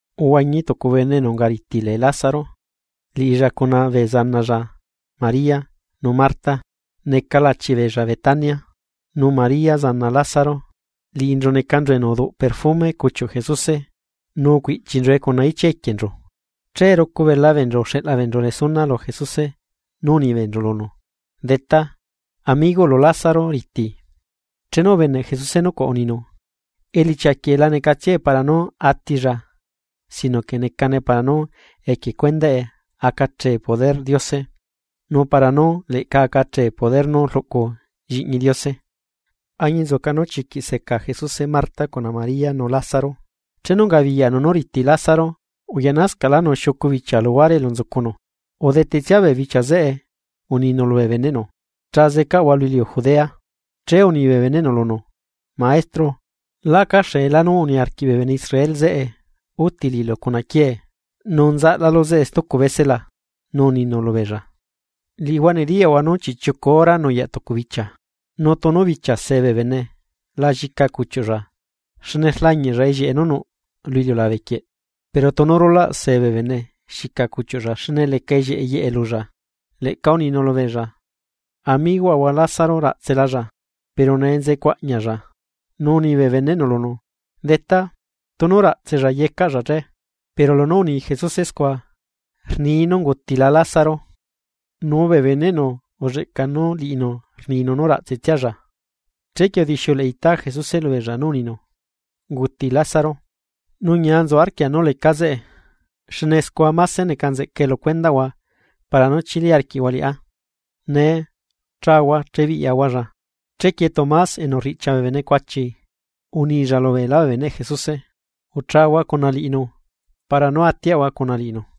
Uhuañi tucu bene enu ungariti lee Lázaro, liꞌilla cuna bee zanalla María nu Marta neca lachi beella Betania. Nu María zana Lázaro, liꞌinchu necanchu enu uduꞌ perfume cuchiuꞌ Jesuse nu ucuiꞌchinchue cuna ichia equienchu. Che rucu bela beenchu uxeꞌla beenchu resuna lu Jesuse nu uni beenchu lunu: ―Detá, amigoꞌlu Lázaro riti. Chenu ubeneꞌ Jesuse nucuaꞌ uninu: ―Elichia quieꞌ lanecatsiae para nú atilla sino que necane para nú equie cuendaꞌe acachee poderꞌ Diose nu para nú leꞌca acachee poder nú rluꞌcu lliꞌñi Diose. Añinzuca nú chiquiꞌ seca Jesuse Marta cuna María nu Lázaro. Chenu ungabiyaꞌnu nú riti Lázaro uyaꞌnascaꞌlánu xiucu bichia luguare elu nzucunu. Udetetsia bee bichia zeꞌe uninu lubee beneꞌnu: ―Cha zecaꞌahua lu iliu Judea. Che uni bee beneꞌnu lunu: ―Maestro, lacaxeelá nú uniarquiꞌ bee bene Israel zeꞌe úti liꞌilu cuna quiee. ¿Nu nzaꞌlalu zeꞌe stucu bese la? Nu uninu lubeella: ―Liꞌihua nediyaꞌhua nú chiꞌchiucu hora nuyaꞌ tucu bichia. Nu tunu bichia see bee bene la llica cuchiuꞌlla, xne rlañiꞌlla ellieꞌe nú nuꞌ lu iliulabe quieꞌ. Pero tunu rulaꞌ see bene xica cuchiuꞌlla xne leca ellieꞌe yeꞌe lulla. Leꞌca uninu lubeella: ―Amigoꞌahua Lázaro raꞌtselalla. Pero nee nzecuaꞌñialla. Nu uni bee beneꞌnu lunu: ―Detá, tunu raꞌtsella yecaꞌcalla che. Pero lunú uni Jesuse scua, rnii nú ungutila Lázaro, nu bee beneꞌnu ulleꞌca nú liꞌinu rninu nú raꞌtsetsialla. Chequie udixiuleꞌe itá Jesuse lubeella nú uninu: ―Unguti Lázaro. Nu ñia nzu arquia nú lecá zeꞌe, xne scua máse neca nzeꞌcae lu cuendaꞌhua para nú chili arquiꞌhua liꞌá. Nee chahua chebiꞌyaꞌahualla. Chequie Tomás enu riꞌchia bee bene “cuachi”, unilla lubeelá bee beneꞌ Jesuse: ―Uchahua cuna liꞌinu para nú atiaꞌahua cuna liꞌinu.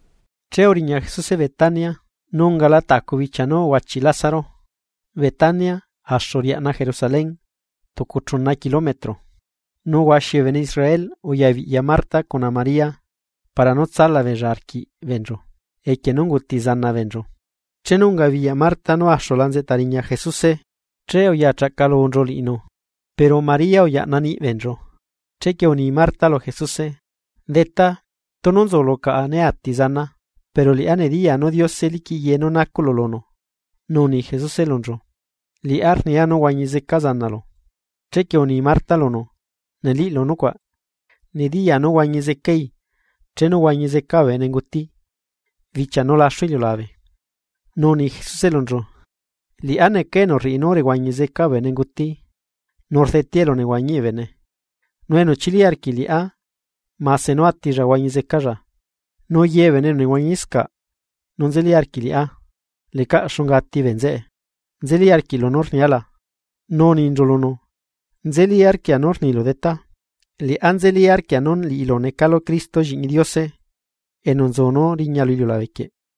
Che uriña Jesuse Betania, nu ungala tacu bichia nú uhuachiꞌ Lázaro. Betania axu riaꞌna Jerusalén, tucu chuna kilometro. Nu huaxi bee bene Israel uya biꞌya Marta cuna María, para nú tsala beella arquiꞌ beenchu equie nú unguti zana beenchu. Chenu ungabiyaꞌ Marta nú axula nzeꞌta riña Jesuse che uyachaꞌcalunchu liꞌinu, pero María uyaꞌna niꞌbeenchu. Chequie uni Marta lu Jesuse: ―Detá, tunu nzulu caꞌa né ati zanaa. Pero liꞌá nediyaa nú Diose liquiꞌ ye nú nacuꞌlu lunu. Nu uni Jesuse lunchu: ―Liꞌá rniaa nú huañi zeca zanalu. Chequie uni Marta lunu: ―Neliꞌlu nucuaꞌ, nediyaa nú huañi zecai chenu huañi zeca bee bene nguti, bichia nú laxu iliulabe. Nu uni Jesuse lunchu: ―Liꞌá neca enu rriꞌi nú rehuañi zeca bee bene nguti nu rdetea elunehuañiꞌ bee bene. Nu enu chili arquiꞌ liꞌá mase nú atilla huañi zecalla. Nu ye bee bene enu nehuañiscaꞌ nu nzeli arquiꞌ liꞌá lecaꞌ xunga ati bee nzeꞌe. ¿Nzelí arquiꞌlu nú rnia la? Nu uninchu lunu: ―Nzelí arquia nú rnilu Detá, liꞌá nzeli arquia nú liꞌilu necalu Cristo Lliꞌñi Diose, enu nzu nú riña lu iliulabe.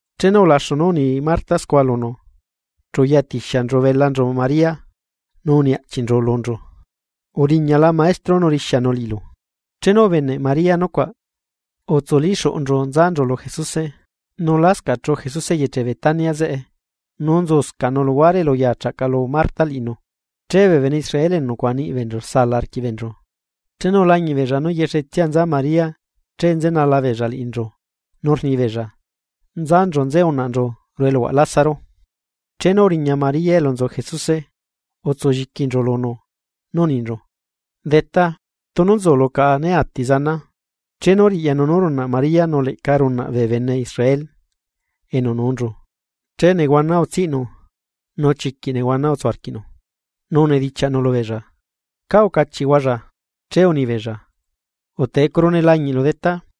Chenu ulaxu nú uni Marta scua lunu, chu uyatixianchu belanchu María, nu uni aꞌchiꞌnchu lunchu: ―Uriñala Maestro nu rixianu liꞌilu. Chenu ubeneꞌ María nucuaꞌ, utsulíxuꞌunchu nzanchu lu Jesuse. Nu lascaꞌ chuꞌu Jesuse eyeche Betania zeꞌe, nu nzuscaꞌnu luhuare elu uyachaꞌcalu Marta liꞌinu. Che bee bene Israel enu nucuaꞌa niꞌi beenchu saala arquiꞌ beenchu, chenu ulañiꞌ beella nú yexetsia nza María che nzenala beella liꞌinchu nu rni beella. Nzanchu nze unaꞌnchu ruꞌu eluhuaꞌ Lázaro. Chenu uriña María elu nzu Jesuse, utsu lliquinchu lunu nú uninchu: ―Detá, tunu nzulu caꞌa né ati zanaa. Chenu riꞌyanu nú runaꞌ María nu leꞌca runaꞌ bee bene Israel enu nuunchu, che nehuana utsiꞌnu, nu chiquiꞌ nehuana utsu arquiꞌnu. Nu unidichiaꞌnu lubeella: ―¿Cá ucachiꞌhualla? Che unibeella: ―Utecuru ne lañiꞌlu Detá,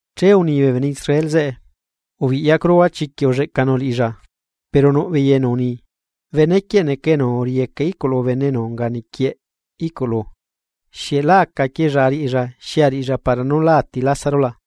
Che uni bee bene Israel zeꞌe: ―¡Biꞌyacuruhua chiquiꞌ ulleꞌcanu liꞌilla! Pero nuꞌ beei enu uni: ―Benequieꞌ neca enu uriyeca iꞌculu bene enu unga niquieꞌ iꞌculu zeꞌe, ¿xieꞌ lá acaquiella ariꞌilla xi ariꞌilla para nú lá ati Lázaro la?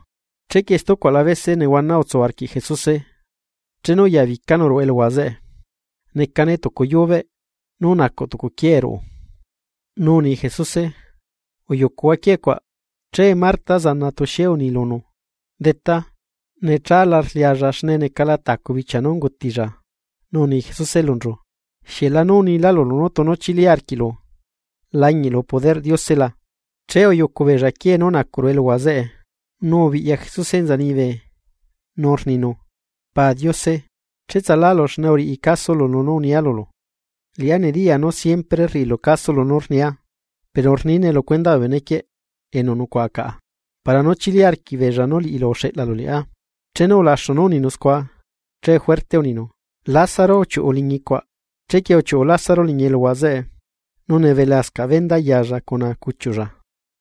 Chequie stucuaꞌla bese nehuana utsu arquiꞌ Jesuse chenu uya bicanu ruꞌu eluhua zeꞌe. Necane tucu yubeꞌ, nu nacuꞌ tucu quiee ruꞌe. Nu uni Jesuse: ―Uyucuhua quiee cuaꞌ. Che Marta zana tuxie uni lunu: ―Detá, nechala rlialla xne necala tacu bichia nú ungutilla. Nu uni Jesuse lunchu: ―¿Xieꞌ lanu unilá lulu nú tunu chili arquiꞌlu, lañiꞌlu poderꞌ Diose la? Che uyucu beella quiee nú nacuꞌ ruꞌu eluhua zeꞌe, nu ubiꞌya Jesuse enza liñibe nu rninu: ―Pa Diose, cheꞌtsalu xne uriꞌi casolu nú unia lulu. Liꞌá nediyaa nú siempre rriꞌilu caso lunú rnia pero rnine lu cuendaꞌ bee bene quieꞌ, enu nucuaꞌa caꞌa, para nú chili arquiꞌbeella nú liꞌilu uxeꞌlalu liꞌá. Chenu ulaxu nú uninu scua che juerte uninu: ―¡Lázaro, uchiuꞌu liñi cuaꞌ! Chequie uchiuꞌu Lázaro liñi eluhua zeꞌe, nu nebelascaꞌ venda yalla cuna cuchiuꞌlla.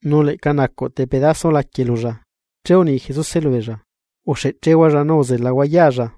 Nu leꞌca nacuꞌ tepedaso laquie lulla, che uni Jesuse lubeella: ―Uxeꞌchehualla nu uzelahua yaalla.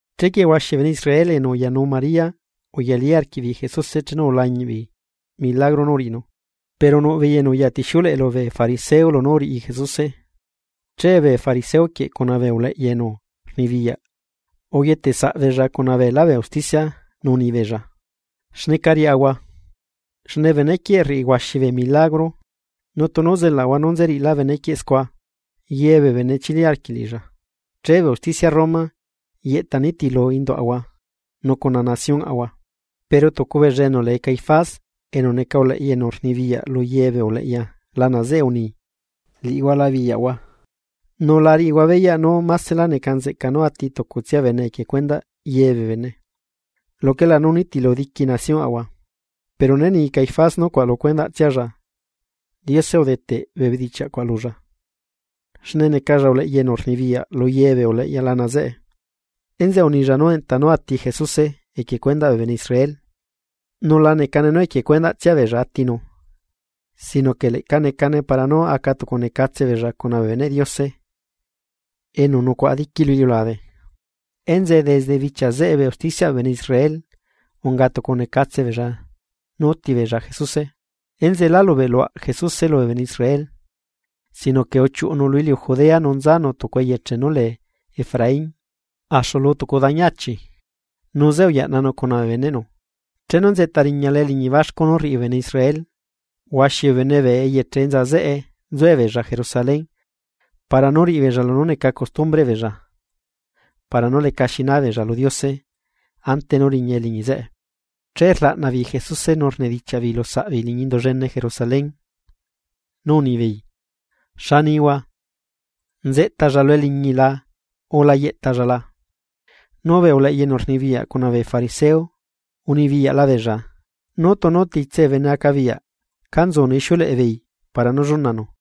Chequie huaxi bee bene Israel enu uyanuu María uyalí arquiꞌbeei Jesuse chenu ulañiꞌ beei milagro nú uriꞌinu. Pero nuꞌbeei enu uyatixiuleꞌe lubee fariseo lunú uriꞌi Jesuse. Che bee fariseo quieꞌ cuna bee uleꞌya enu rnibiyaꞌ uquieteꞌ saꞌbeella cuna beelá bee usticia nu uni beella: ―¿Xneca riaꞌahua? Xne bene quieꞌ rriꞌi huaxi bee milagro. Nu tunu zelaꞌahua nú nzeriꞌilá benequieꞌ scua, ye bee bene chili arquiꞌ liꞌilla, che bee usticia Roma yeꞌta nitilu induꞌahua nu cuna naciónꞌahua. Pero tucu beella enu lee Caifás enu neca uleꞌya enu rnibiyaꞌ lu ye bee uleꞌya lana zeꞌe uni: ―Liꞌihua la biyaꞌhua, nu la riꞌihua beyaꞌ nú másela neca nzeꞌca nú ati tucutsia bene equie cuendaꞌ ye bee bene, luquela nú nitilu diqui naciónꞌahua. Pero né ni Caifás nucuaꞌ lu cuendaꞌtsialla. Diose udeteꞌ bee bedichiaꞌ cuaꞌ lulla, xne necalla uleꞌya enu rnibiyaꞌ lu ye bee uleꞌya lana zeꞌe, enzeꞌe unilla nú enta nú ati Jesuse equie cuendaꞌ bee bene Israel; nu la necane nú equie cuendaꞌtsia beella atinu, sino que leꞌca necane para nú acatucunecatse beella cuna bee beneꞌ Diose enu nucuaꞌa diqui lu iliulabe. Enzeꞌe desde bichia zeꞌe bee usticiaꞌ bee bene Israel unga tucunecatse beella nú útibeella Jesuse. Enzeꞌe lá lubeꞌluaꞌ Jesuse lubee bene Israel. Sino que uchiuꞌunu lu iliu Judea nu nzanu tucu eyeche nú lee Efraín axu lu tucu dañi achi, nu zeꞌe uyaꞌnanu cuna bee beneꞌnu. Chenu nzeꞌta riñala eliñi baxcu nú rriꞌi bee bene Israel. Huaxi bee bene bee eyeche enza zeꞌe nzuebeella Jerusalén para nú riꞌibeella lunú neca costumbreꞌ beella para nú lecaxi naa beella lu Diose ante nú riña eliñi zeꞌe. Che rlaꞌna beei Jesuse nu rnedichiaꞌ beei lu saꞌbeei liñi Indu llene Jerusalén, nú unibeei: ―¿Xa nihua? ¿Nzeꞌtalla lu eliñi la o la yeꞌtalla la? Nu bee uleꞌya enu rnibiyaꞌ cuna bee fariseo unibiyaꞌla beella, nú tunu titse bee bene acabiyaꞌ cá nzunu ixiuleꞌe beei para nú llunanu.